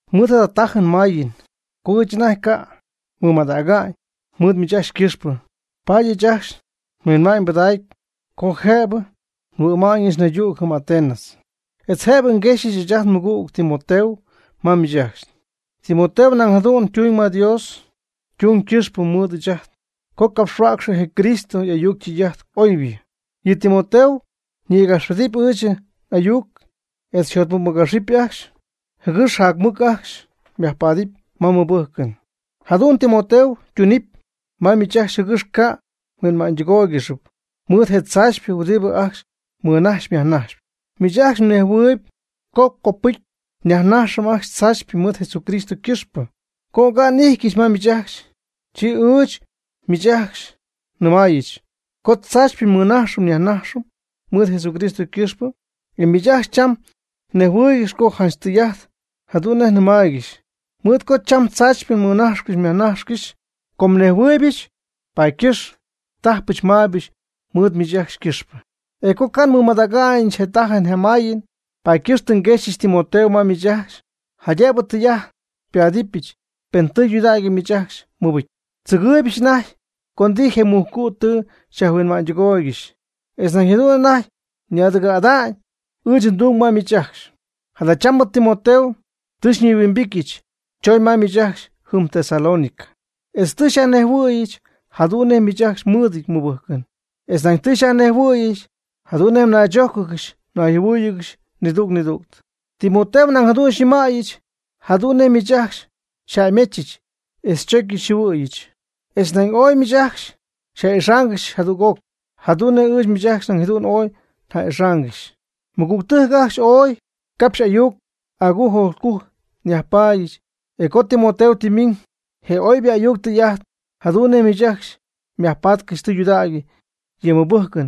Mɨɨd jada tajɨn mayɨn co ɨɨch anajty ca' nmɨmadäga'ñ mɨɨd miich ajcxy ycɨxpɨ, paady ɨɨch ajcxy nhuinma'ñ nbɨdägy co jëbɨ nhuɨ'ma'ñɨch naydüg jɨm Atenas, etz jëbɨ nguexyɨch ɨɨch ajt nmɨgüg Timoteo ma miich ajcxy. Timoteo nañ jadu'n ytuñ ma Dios ytung quipxyɨ mɨɨd ɨɨch co ngapxhuäcxyɨch je Cristo y'ayuc ytɨy'ajt oybɨ. Yɨ Timoteo ñïgapxpedɨpy ɨɨch n'ayuc etz xyjotmɨcmɨgapxɨp ajcxy, jɨgɨx jac mɨc ajcxy myajpaadɨp ma mmɨbɨjcɨn. Jadu'n Timoteo ytunɨpy ma miich ajcxy jɨgɨx ca' mhuinma'ñytɨgóoygɨxɨp mɨɨd je tzaachypɨ huɨdibɨ ajcxy mmɨnajxyp myajnajxyp. Miich ajcxy mnejhuɨɨyb co copɨcy myajnaxɨpy ajcxy tzaachypɨ mɨɨd Jesucristo ycɨxpɨ. Co oga'n n'ijtyɨch ma miich ajcxy, chi ɨɨch miich ajcxy nnɨmaayɨch co tzaachypɨ mmɨnájxcɨxɨpy myajnájxcɨxɨpy mɨɨd Jesucristo ycɨxpɨ. E miich ajcxy cham mnejhuɨɨygɨxyp co janch tɨy'ajt jadu'n nej nnɨmaaygɨxy, mɨɨd co cham tzaachypɨ mmɨnajxcɨxy myajnajxcɨxy. Com nejhuɨɨybɨch co tzaachypɨ mmɨnajxyp myajnajxyp ajcxy, paady ycɨxpɨ tajpɨch maybɨch mɨɨd miich ajcxy ycɨxpɨ. E com ca' nmɨmadäga'ñɨch je tajɨn je mayɨn, paady ycɨxp tɨ nguexyɨch Timoteo ma miich ajcxy jaydëbɨ tɨy'ajt xypáadɨbɨch pen tɨydudägy miich ajcxy mmɨbɨcy. Tzɨgɨɨybɨch anajty co ndijy je mujcu' tɨ xyajhuinma'ñytɨgooygɨxy, etz jadu'n anajty ñaadɨgɨ̈'ada'ñ ɨɨch ndung ma miich ajcxy. Jadachambɨ Timoteo tɨ xyñihuimbityɨch, chooñ ma miich ajcxy jɨm Tesalónica, etz tɨ xyajnejhuɨ̈yɨch jadu'n nej miich ajcxy mmɨɨdɨty mmɨbɨjcɨn, etz nañ tɨ xyajnejhuɨ̈yɨch jadu'n nej mnaychójcɨgɨxy mnayjɨhuɨ́ɨyɨgɨxy nidüg nidüg. Timoteo nañ jadu'n xyñɨmaaybɨch jadu'n nej miich ajcxy xyjäymechɨch etz xychocy xyjɨhuɨ̈yɨch, etz nañ ooy miich ajcxy xyja'ixáangɨxyɨch jadüg'oc, jadu'n nej ɨɨch miich ajcxy nañ jadu'n ooy nja'ixaangɨxy. Mɨgügtɨjc ajcxy, ooy capxy agujc ayuc agujc nyajpaadyɨch. E co Timoteo tɨ mɨmiñ je oybɨ ayuc tɨy'ajt jadu'n nej miich ajcxy mjacpanɨcxy tɨydudägy yɨ mɨbɨjcɨn,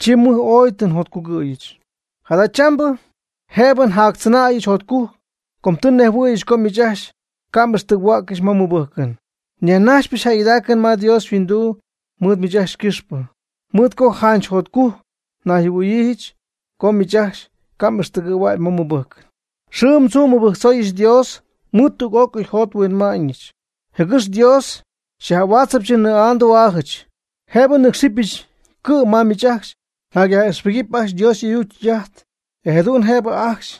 chi mɨj ooy tɨ njotcugɨ̈yɨch. Jadachambɨ jëbɨ njactzɨnäyɨch jotcujc, com tɨ nnejhuɨ̈yɨch co miich ajcxy ca' m'ixtɨgɨ̈huäccɨxy ma mmɨbɨjcɨn. Nyajnajxpɨch jäygɨdaacɨn ma Dios yhuinduu mɨɨd miich ajcxy ycɨxpɨ, mɨɨd co janch jotcujc nayjɨhuɨ̈yiijɨch co miich ajcxy ca' m'ixtɨgɨ̈huägy ma mmɨbɨjcɨn. Xɨɨm tzuum nmɨbɨjctzooyɨch Dios mɨɨd tüg'ócɨy njot nhuinma'ñɨch, jɨgɨx Dios xyaj'ahuáatzɨbɨch nnɨɨ'aa ndü'aajɨch, jëbɨ nnɨcxyɨch cɨ'm ma miich ajcxy, jaydëbɨ njacyaj'ijxpɨgɨpy ajcxy Dios y'ayuc ytɨy'ajt, e jadu'n jëbɨ ajcxy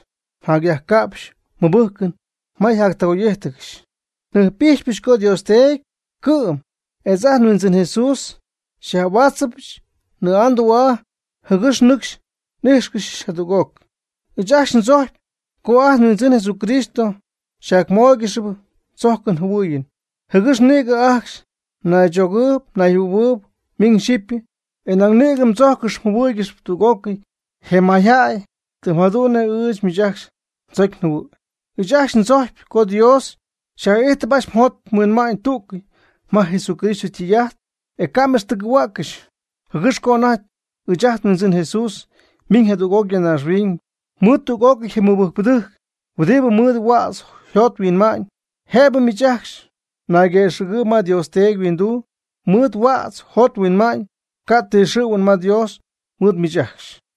mjacyajca'pxy mmɨbɨjcɨn ma mjacyajtɨgoy'ijtcɨxy. Njɨjp'ijxypɨch co Dios Teedy cɨ'm etz ajt nHuindzɨn Jesús xyaj'ahuáatzɨbɨch nnɨɨ'aa ndü'aa jɨgɨx nɨcxy n'ijxcɨxy jadüg'oc. Ɨɨch ajcxy ndzojcpy co ajt nHuindzɨn Jesucristo xyjacmóoygɨxɨpy tzojcɨn jɨhuɨɨyɨn, jɨgɨx nïgɨ ajcxy mnaychogɨɨyb mnayjɨhuɨ̈huɨɨyb miñ xyɨpy, e nañ nïgɨ mdzójcɨxɨpy mjɨhuɨ́ɨygɨxɨpy tüg'ócɨy je mayjäy, tɨm jadu'n nej ɨɨch miich ajcxy ndzocy njɨhuɨ̈y. Ɨɨch ajcxy ndzojcpy co Dios xyaj'ijtɨp ajcxy mjot mhuinma'ñ tüccɨ'y ma Jesucristo ytɨy'ajt, e ca' m'ixtɨgɨ̈huäccɨxy, jɨgɨx co anajty ɨɨch ajt nHuindzɨn Jesús ymiiñ jadüg'oc ya naaxhuiñ mɨɨd tüg'ócɨy je mɨbɨjcpɨdɨjc huɨdibɨ mɨɨd huädz yjot yhuinma'ñ, jëbɨ miich ajcxy mnayguëxɨ̈gɨɨyb ma Dios Teedy yhuinduu mɨɨd huädz mjot mhuinma'ñ, ca' ti xɨ̈huɨn ma Dios mɨɨd miich ajcxy.